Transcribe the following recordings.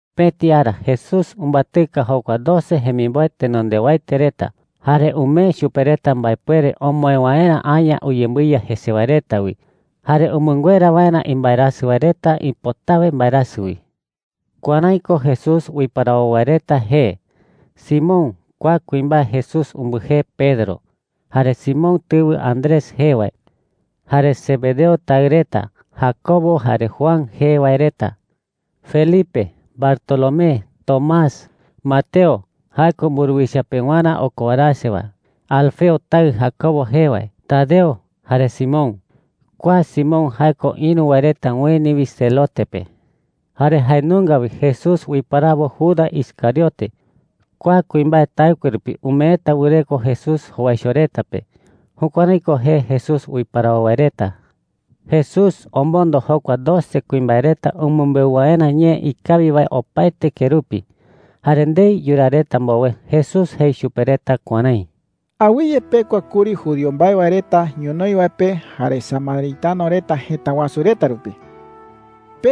Pëti ara Jesús umbatɨka jokua doce jemimboe tenondewaete reta, jare umee chupe reta mbaepuere omoë waerä aña uyembɨiya jese wae reta wi jare umɨnguera waerä imbaerasɨ wae reta ipotawe mbaerasɨ wi. Kuärái ko Jesús uiparawo wae reta jee: Simón (kua kuimbae Jesús umbɨjee Pedro), jare Simón tɨwɨ Andrés jee wae, jare Zebedeo taɨ reta Jacobo jare Juan jee wae reta, Felipe, Bartolomé, Tomás, Mateo (jae ko mburuwicha pewarä okowarase wae), Alfeo taɨ Jacobo jee wae, Tadeo, jare Simón (kua Simón jae ko ïru wae reta ueni wi Zelote pe). Jare jae nunga wi Jesús uiparawo Judas Iscariote (kua kuimbae taɨkue rupi umeeta wɨreko Jesús jowaicho reta pe). Jukuärái ko jee Jesús uiparawo wae reta. Jesús omondo jokua doce kuimbae reta umɨmbeu waerä ñee ikawi wae opaete kerupi. Jare ndei yuraa reta mbowe, Jesús jei chupe reta kuärái: “Awɨye pekua kuri judío mbae wae reta ñonoï wae pe jare samaritano reta jëta wasu reta rupi,” jei chupe reta.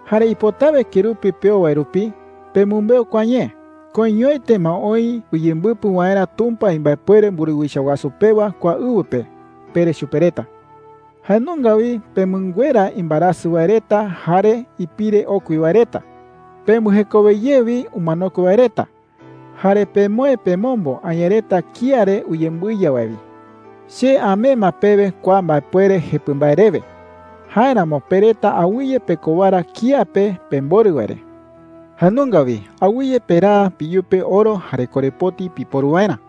“Jare ipotawe kerupi peo wae rupi, pemɨmbeu kua ñee: ‘Koiñoete ma oï uyembɨpɨ waerä Tumpa imbaepuere mburuwicha wasu pewa kua ɨwɨ pe,’ pere chupe reta,” jei. “Jae nunga wi pemɨnguera imbaerasɨ wae reta jare ipire okui wae reta. Pembɨjekowe ye wi umanokue wae reta. Jare pemoë pemombo aña reta kía re uyembɨiya wae wi,” jei. “Che amee ma pewe kua mbaepuere jepɨ mbae rewe. Jáeramo pe reta awɨye pekowara kía pe pemborɨ wae re,” jei chupe reta. “Jae nunga wi awɨye peraa peyupe oro jare korepoti piporu waerä.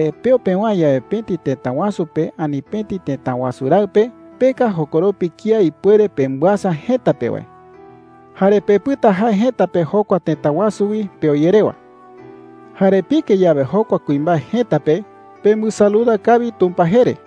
“Jare peo pewäe yawe pëti tëta wasu pe ani pëti tëta wasu raɨ pe, peka jokoropi kía ipuere pembɨasa jëta pe wae. Jare pepɨta jae jëta pe jokua tëta wasu wi peo ye rewa,” jei. “Jare pike yawe jokua kuimbae jëta pe, pembɨsaluda kawi Tumpa jee re.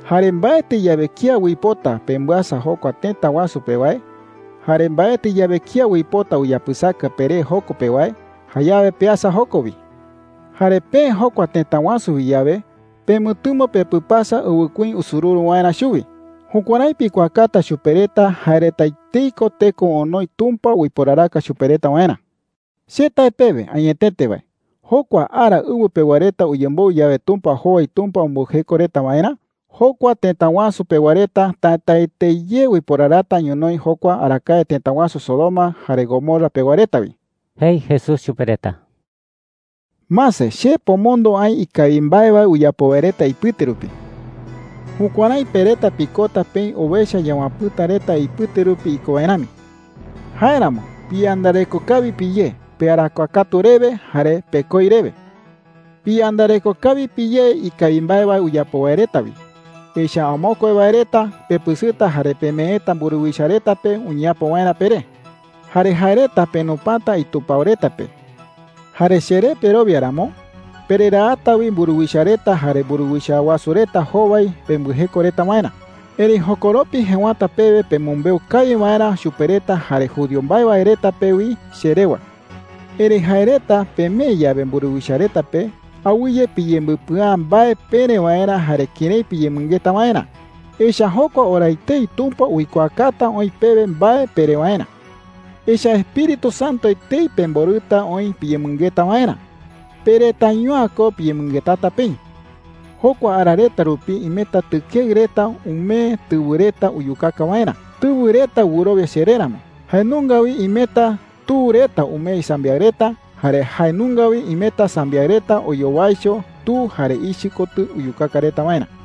“Jare mbaetɨ yawe kía uipota pembɨasa jokua tëta wasu pe wae, jare mbaetɨ yawe kía uipota uyapɨsaka peré joko pe wae, jayawe peasa joko wi,” jei. “Jare peë jokua tëta wasu wi yawe, pemɨtɨmo pepɨpasa ɨwɨkuí usururu waerä chuwi. Jukuärái pikuaakata chupe reta jae reta etei ko teko onoi Tumpa uiporaraka chupe reta waerä,” jei. “Che tae pewe añetete wae, jokua ara ɨwɨ pewa reta uyemboɨ yawe Tumpa jowai Tumpa umbɨjeko reta waerä, jokua tëta wasu pewa reta tätaete ye uiporarata ñonoï jokua arakae tëta wasu Sodoma jare Gomorra pewa reta wi,” jei Jesús chupe reta. “Mase, che pomondo aï ikawi mbae wae uyapo wae reta ipɨte rupi,” jei chupe reta. “Jukuärái pe reta pikota peï owecha yawapɨ̈ta reta ipɨte rupi iko wae rami. Jáeramo piyandareko kawi piyé pearakuaa katu rewe jare pekoi rewe,” jei. “Piyandareko kawi piyé ikawi mbae wae uyapo wae reta wi. Echa’ä amokue wae reta pepɨsɨta jare pemeeta mburuwicha reta pe uñeapo waerä peré,” jei. “Jare jae reta penupata itupao reta pe. Jare cheré perowia ramo, pereraata wi mburuwicha reta jare mburuwicha wasu reta jowai pembɨjeko reta waerä. Erëi jokoropi jëwata pewe pemɨmbeu kawi waerä chupe reta jare judío mbae wae reta pe wi che rewa,” jei. “Erëi jae reta pemee yawe mburuwicha reta pe, awɨye piyembɨpɨa’ä mbae pere waerä jare kërái piyemɨngeta waerä. Echa’ä jokua ora etei Tumpa uikuaakata oï pewe mbae pere waerä,” jei. “Echa’ä Espíritu Santo etei pemborɨta oï piyemɨngeta waerä. Pe retaiño’ä ko piyemɨngetata peï,” jei chupe reta. “Jokua ara reta rupi imeta tɨkeɨ reta umee tɨwɨ reta uyukaka waerä, tɨwɨ reta wɨrowia cheré ramo. Jae nunga wi imeta tu reta umee isambiaɨ reta. Jare jae nunga wi imeta sambiaɨ reta oyowaicho tu jare ichɨ kotɨ uyukaka reta waerä,” jei.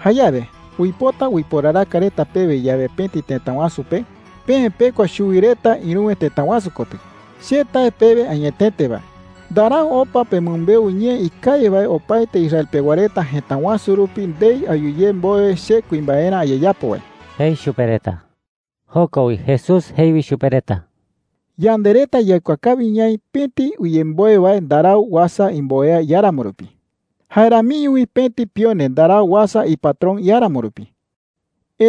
“Jayawe uipota uiporaraka reta pewe yawe pëti tëta wasu pe, peë pekua chuwi reta ïruwe tëta wasu kotɨ. Che tae pewe añetete wae, ndarau opa pemɨmbeu ñee ikawi wae opaete Israel pewa reta jëta wasu rupi ndei ayu ye mbowe che kuimbaerä ayeyapo wae,” jei chupe reta. Joko wi Jesús jei wi chupe reta: “Yande reta yaikuaa kawi ñaï pëti uyemboe wae ndarau uasa imboea iáramo rupi. Jae ramiño wi pëti pione ndarau uasa ipatrón iáramo rupi,” jei.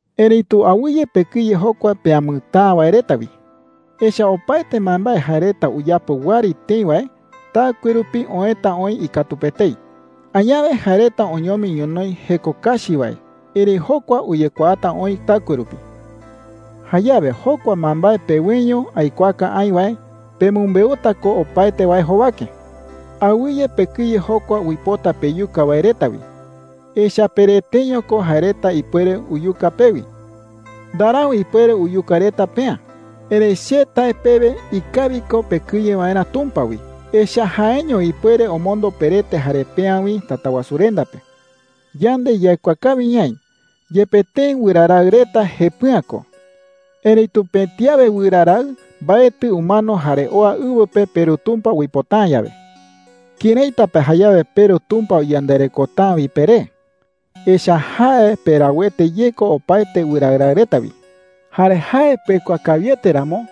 “Erëitu awɨye pekɨye jokua peamɨtäa wae reta wi,” jei. “Echa’ä opaete mbaembae jae reta uyapo wɨari tëi wae, taɨkue rupi oëta oï ikatu pe etei. Añawe jae reta oñomi ñonoï jeko kachi wae, erëi jokua uyekuaata oï taɨkue rupi,” jei. “Jayawe jokua mbaembae peweño aikuaaka aï wae, pemɨmbeuta ko opaete wae jowake,” jei chupe reta. “Awɨye pekɨye jokua uipota peyuka wae reta wi. Echa’ä pereteño ko jae reta ipuere uyuka pewi. Ndarau ipuere uyuka reta peä,” jei. “Erëi che tae pewe ikawi ko pekɨye waerä Tumpa wi. Echa’ä jaeño ipuere omombo perete jare peä wi Tatawasurenda pe,” jei chupe reta. “Yande yaikuaa kawi ñaï, yepe tëi wɨra raɨ reta jepɨ'ä ko, erëitu pëti awe wɨra raɨ mbaetɨ umano jare oa ɨwɨ pe peRu Tumpa uipota’ä yawe. ¿Këraita pa jayawe peRu Tumpa uyandarekota’ä wi peré? Echa’ä jae perauete ye ko opaete wɨra raɨ reta wi,” jei chupe reta. “Jare jae pekuaa kawiete ramo,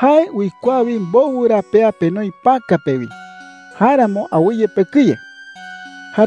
jae uikuaa wi mbowɨ ra pea penoi päka pe wi. Jáeramo awɨye pekɨye,” jei Jesús chupe reta.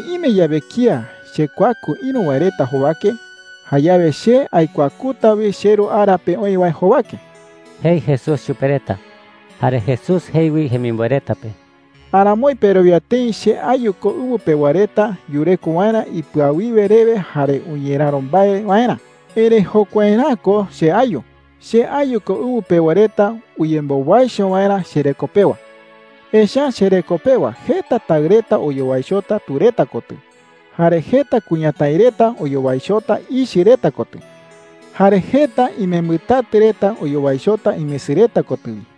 “Erëi ime yawe kía chekuaku ïru wae reta jowake, jayawe che aikuakuta wi cheRu ara pe oï wae jowake,” jei Jesús chupe reta. Jare Jesús jei wi jemimboe reta pe: “Aramoi perowia tëi che ayu ko ɨwɨ pewa reta yureko waerä ipɨawiwe rewe jare uñeräro mbae waerä. Erëi jokuaerä'ä ko che ayu. Che ayu ko ɨwɨ pewa reta uyembowaicho waerä chereko pewa,” jei. “Echa’ä chereko pewa jeta taɨ reta oyowaichota tu reta kotɨ, jare jeta kuñatái reta oyowaichota ichɨ reta kotɨ, jare jeta imembɨtatɨ reta oyowaichota imesɨ reta kotɨ wi.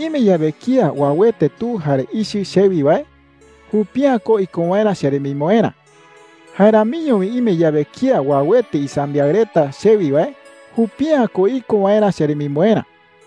“Erëi ime yawe kía uauete tu jare ichɨ chewi wae, jupi’ä ko iko waerä cheremimboerä. Jae ramiño wi ime yawe kía uauete isambiaɨ reta chewi wae, jupi’ä ko iko waerä cheremimboerä.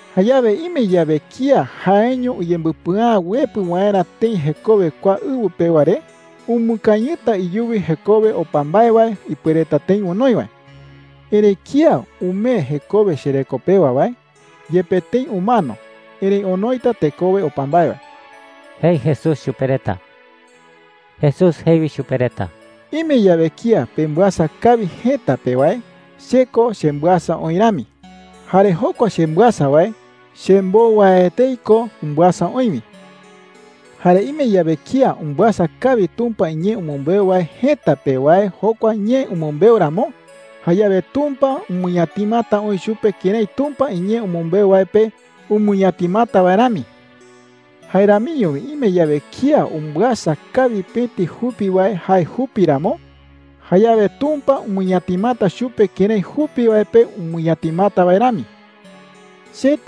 “Jayawe ime yawe kía jaeño uyembɨpɨa’ä uepɨ waerä tëi jekowe kua ɨwɨ pewa re, umɨkañɨta iyuwi jekowe opa mbae wae ipuereta tëi onoi wae. Erëi kía umee jekowe chereko pewa wae, yepe tëi umano, erëi onoita tekowe opa mbae wae,” jei Jesús chupe reta. Jesús jei wi chupe reta: “Ime yawe kía pembɨasa kawi jëta pe wae, che ko chembɨasa oï rami. Jare jokua chembɨasa wae, chembou wae etei ko umbɨasa oï wi,” jei. “Jare ime yawe kía umbɨasa kawi Tumpa iñee umɨmbeu wae jëta pe wae jokua ñee umɨmbeu ramo, jayawe Tumpa umɨñatimata oï chupe kërái Tumpa iñee umɨmbeu wae pe umɨñatimata wae rami,” jei. “Jae ramiño wi ime yawe kía umbɨasa kawi pëti jupi wae jae jupi ramo, jayawe Tumpa umɨñatimata chupe kërái jupi wae pe umɨñatimata wae rami,” jei.